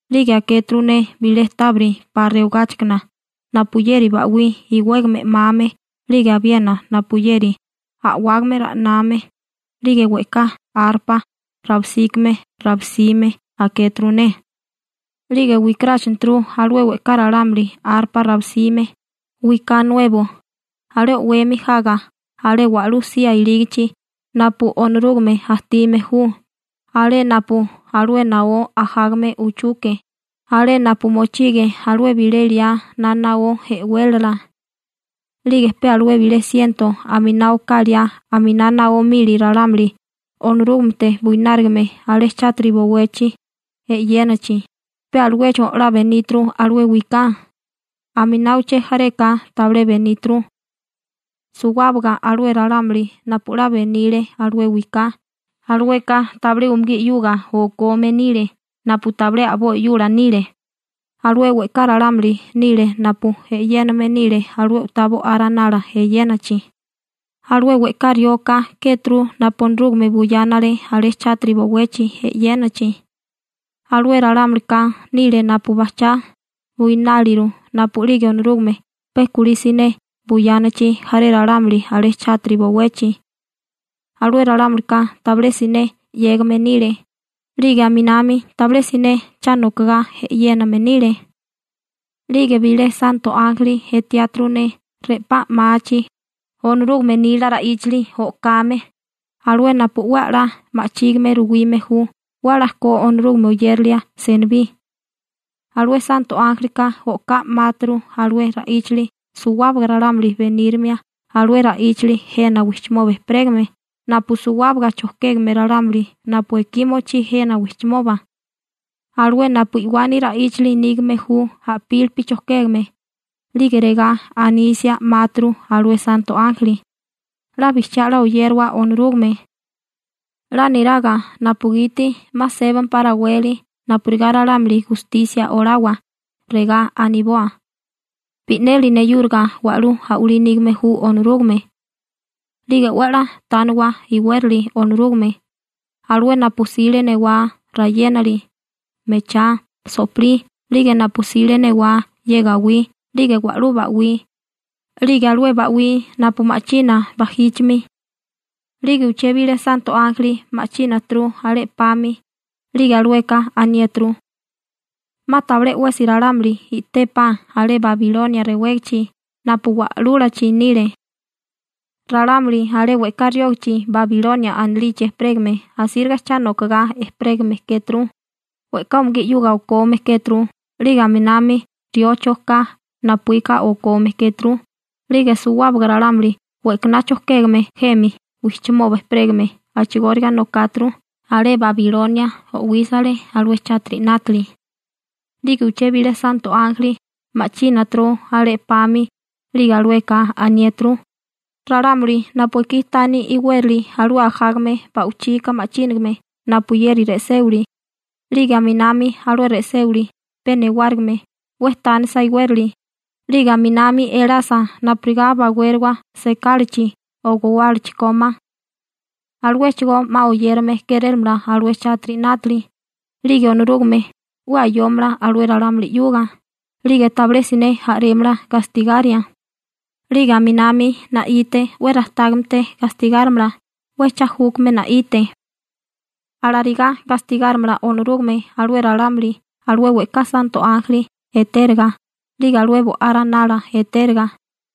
'lige akéturu ne bilé tábiri 'pa rewigáchikana napuyeri ba'wí iwégame 'mame 'lige abiena napuyeri a'wágame ra'name, 'lige we'ká arpa rabisíkime rabisime akéturu ne. 'Lige wikaráchaneturu alué we'ká ralámuli arpa rabisime, wiká nuebo, alé o'wemi jaga alé wa'lú sía ilígichi napu Onorúgame ajtime ju, alé napu alué naó ajágame uchuke, alé napu mochige alué bilé liá na naó e'wélala. 'Lige pe alué bilé siento aminá oká liá aminá naó mili ralámuli Onorúgamete buinárigame alé chátiri bowechi e'yénachi, pe aluecho 'la beníturu alué wiká. Aminá uché jareka tabilé beníturu. Suwábaga alué ralámuli napu 'la benile alué wiká, alueka tabilé umugí 'yuga okome nile napu tabilé a'boi 'yula nile. Alué we'ká ralámulika nile napu e'yéname nile alué u'tá Bo'á Ranala eyénachi. Alué we'ká rioka kéturu napu Onorúgame buyánale alé chátiri bowechi e'yénachi. Alué ralámulika nile napu bajchá buináliru napu'lige Onorúgame pe kulí siné buyánachi jaré ralámuli alé chátiri bowechi. Alué ralámulika tabilé siné 'yégame nile, 'lige aminami tabilé siné cha nokagá e'yéname nile. 'Lige bilé santo ánjeli etiáturu ne re'pá 'máachi, Onorúgame nila ra'íchali o'kame, alué napu 'we 'la ma'chígime ruwime ju 'we 'la ko Onorúgame oyérilia senibí. Alué santo ánjelika o'ká 'máaturu alué ra'íchali suwábaga ralámuli benírimia alué ra'íchali jena wijchimoba ejperégame napu suwábaga chojkégame ralámuli napu ekí mochí jena wijchimoba, alué napu i'wani ra'íchali nígame ju a'pílipi chojkégame, 'lige regá anisia 'máaturu alué santo ánjeli: ―'La bijchiá 'la oyérawa Onorúgame, 'la niraga napugiti 'ma sébampá raweli napurigá Onorúgame gustisia olámala ralámuli, regá aniboa: «Bi'neli neyúriga wa'lú a'walí nígame ju Onorúgame.» 'Lige 'we 'la tániwa iwérali Onorúgame, alué napu 'sile newá rewagá, rayénali, mechá, so'pilí 'lige napu 'sile newá ye gawí 'lige wa'lú ba'wí, 'lige alué ba'wí napu ma'china bajíchimi. 'Lige uché bilé santo ánjeli ma'chínaturu alé 'pami, 'lige alueka aniéturu: ―'Ma tabilé 'wesi ralámuli i'tépá alé Babilonia rewégichi napu wa'lúlachi nile. Ralámuli alé we'ká riógichi Babilonia anilichi ejperégame asíriga cha nokagá ejperégame kéturu, we'ká umugí 'yuga okome kéturu, 'lige aminami riocho ka napuíka okome kéturu, 'lige suwábaga ralámuli we'kaná chojkégame jemi wijchimoba ejperégame a'chigóriga nokáturu, alé Babilonia o'wísale alué chátiri 'nátili. 'Lige uché bilé santo ánjeli ma'chínaturu alé 'pami, 'lige alueka aniéturu: ―Ralámuli napu ekí tani iwérali alué ajágame ba'wichika ma'chínigame napuyeri re'séwili, 'lige aminami alué re'séwili pe newárigime 'we tánisa iwérali, 'lige aminami elasa napurigá bawériwa sekálachi o gowálachi kómá, aluéchigó 'ma oyérame kérélamala alué chátiri 'nátili, 'lige Onorúgame 'we ayómala alué ralámuli 'yuga, 'lige tabilé siné a'rémala gastigaria, 'lige aminami na'ite 'we rajtágamete gastigárimala 'we cha júkame na'ite. Alarigá gastigárimala Onorúgame alué ralámuli alué we'ká santo ánjeli etériga 'lige alué Bo'á Ranala etériga,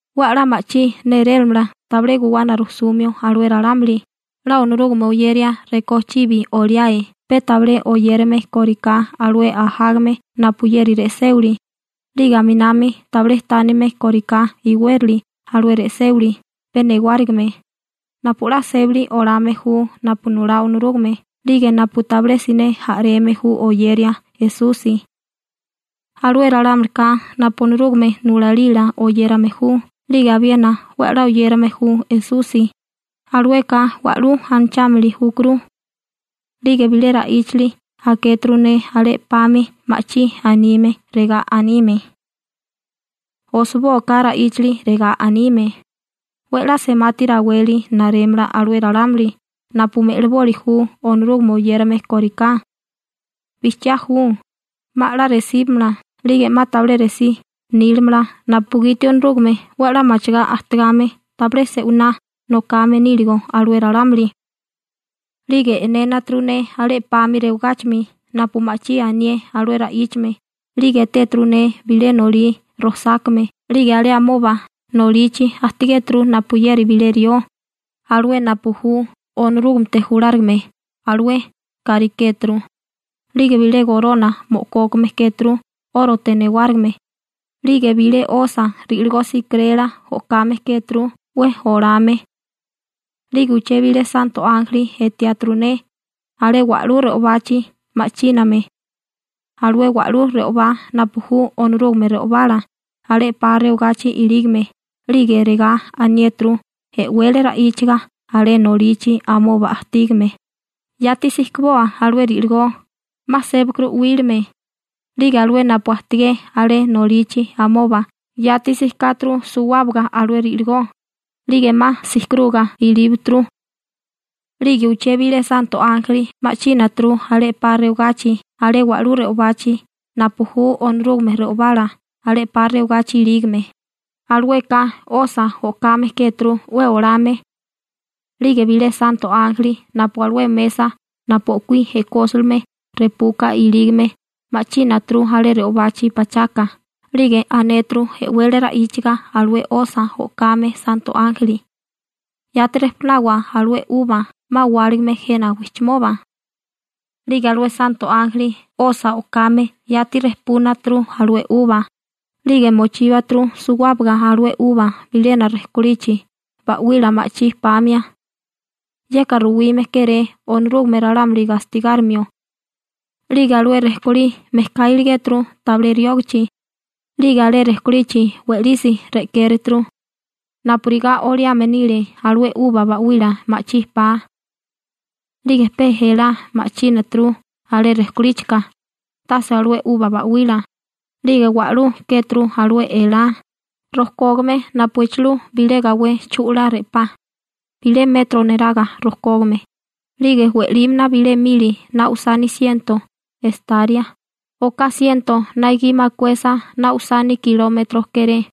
'We 'la ma'chí nérélimala tabilé guwana rujsumio alué ralámuli 'la Onorúgame oyeria rekó chibi oliáe pe tabilé oyérame kóriká alué ajágame napuyeri re'séwili 'lige aminami tabilé tánime kóriká iwérali alué re'séwili pe newárigime, napu 'la sébali olame ju napu nulá Onorúgame 'lige napu tabilé siné a'reme ju oyeria Esusi. Alué ralámulika napu Onorúgame nulalila oyérame ju 'lige abiena 'we 'la oyérame ju Esusi, alueka wa'lú anachámili júkuru. 'Lige bilé ra'íchali akéturu ne alé 'pami ma'chí anime, regá anime: ―Osibóaká ra'íchali regá anime: 'We 'la semati raweli narémala alué ralámuli napu me'liboli ju Onorúgame oyérame kóriká. Bijchiá ju, 'ma 'la resíbamala, 'lige 'ma tabilé resí nílamala napugiti Onorúgame 'we 'la machigá ajtigame tabilé se'winá nokame níligo alué ralámuli. 'Lige e'nénaturu ne alé 'pami rewagáchimi napu ma'chí anié alué ra'íchame 'lige etéturu ne bilé nolí rojsákame 'lige alé amoba nolichi ajtigéturu napuyeri bilé rió, alué napu ju Onorúgamete julárigame alué kárikéturu, 'lige bilé gorona mo'kókame kéturu 'órote newárigime, 'lige bilé 'osa ri'ligó sijkirela o'kame kéturu 'we olame. 'Lige uché bilé santo ánjeli etiáturu ne alé wa'lú re'obachi ma'chíname, alué wa'lú re'obá napu ju Onorúgame re'obala alé 'pa rewagachi ilígame 'lige regá aniéturu e'wele ra'íchaga alé nolichi amoba ajtígame: ―Yati sijkiboa alué ri'ligó, 'ma sébakuru 'wílime. 'Lige alué napu ajtigé alé nolichi amoba yati sijkáturu suwábaga alué ri'ligó, 'lige 'ma sijkiruga ilíbaturu. 'Lige uché bilé santo ánjeli ma'chínaturu alé 'pa rewagachi alé wa'lú re'obachi napu ju Onorúgame re'obala alé 'pa rewagachi ilígame. Alueka 'osa o'kame kéturu 'we olame. 'Lige bilé santo ánjeli napu alué mesa napu o'kuí e'kósilime repuka ilígame ma'chínaturu alé re'obachi pachaka 'lige anéturu e'wele ra'íchaga alué 'osa o'kame santo ánjeli: ―Yati rejpunawa alué 'uba 'ma wáligame jena wijchimoba. 'Lige alué santo ánjeli 'osa o'kame yati rejpúnaturu alué i'wilí ('uba), 'lige mochíbaturu suwábaga alué i'wilí bilena rejkolichi ba'wila ma'chí pamia. Yeka ruwime kéré Onorúgame ralámuli gastigárimio. 'Lige alué rejkolí mejká iligéturu tabilé riógichi, 'lige alé rejkolichi we'lisi re'kéreturu, napurigá oliame nile alué 'uba ba'wila ma'chí pa, 'lige pe elá ma'chínaturu alé rejkolíchika, tase alué 'uba ba'wila, 'lige wa'lú kéturu alué elá, rojkógame napu echilú bilé gawé chu'lá re'pá (bilé metro neraga rojkógame) 'lige we'límana bilé mili na usani siento estaria (oká siento na gi makuesa na usani kilómetro kéré).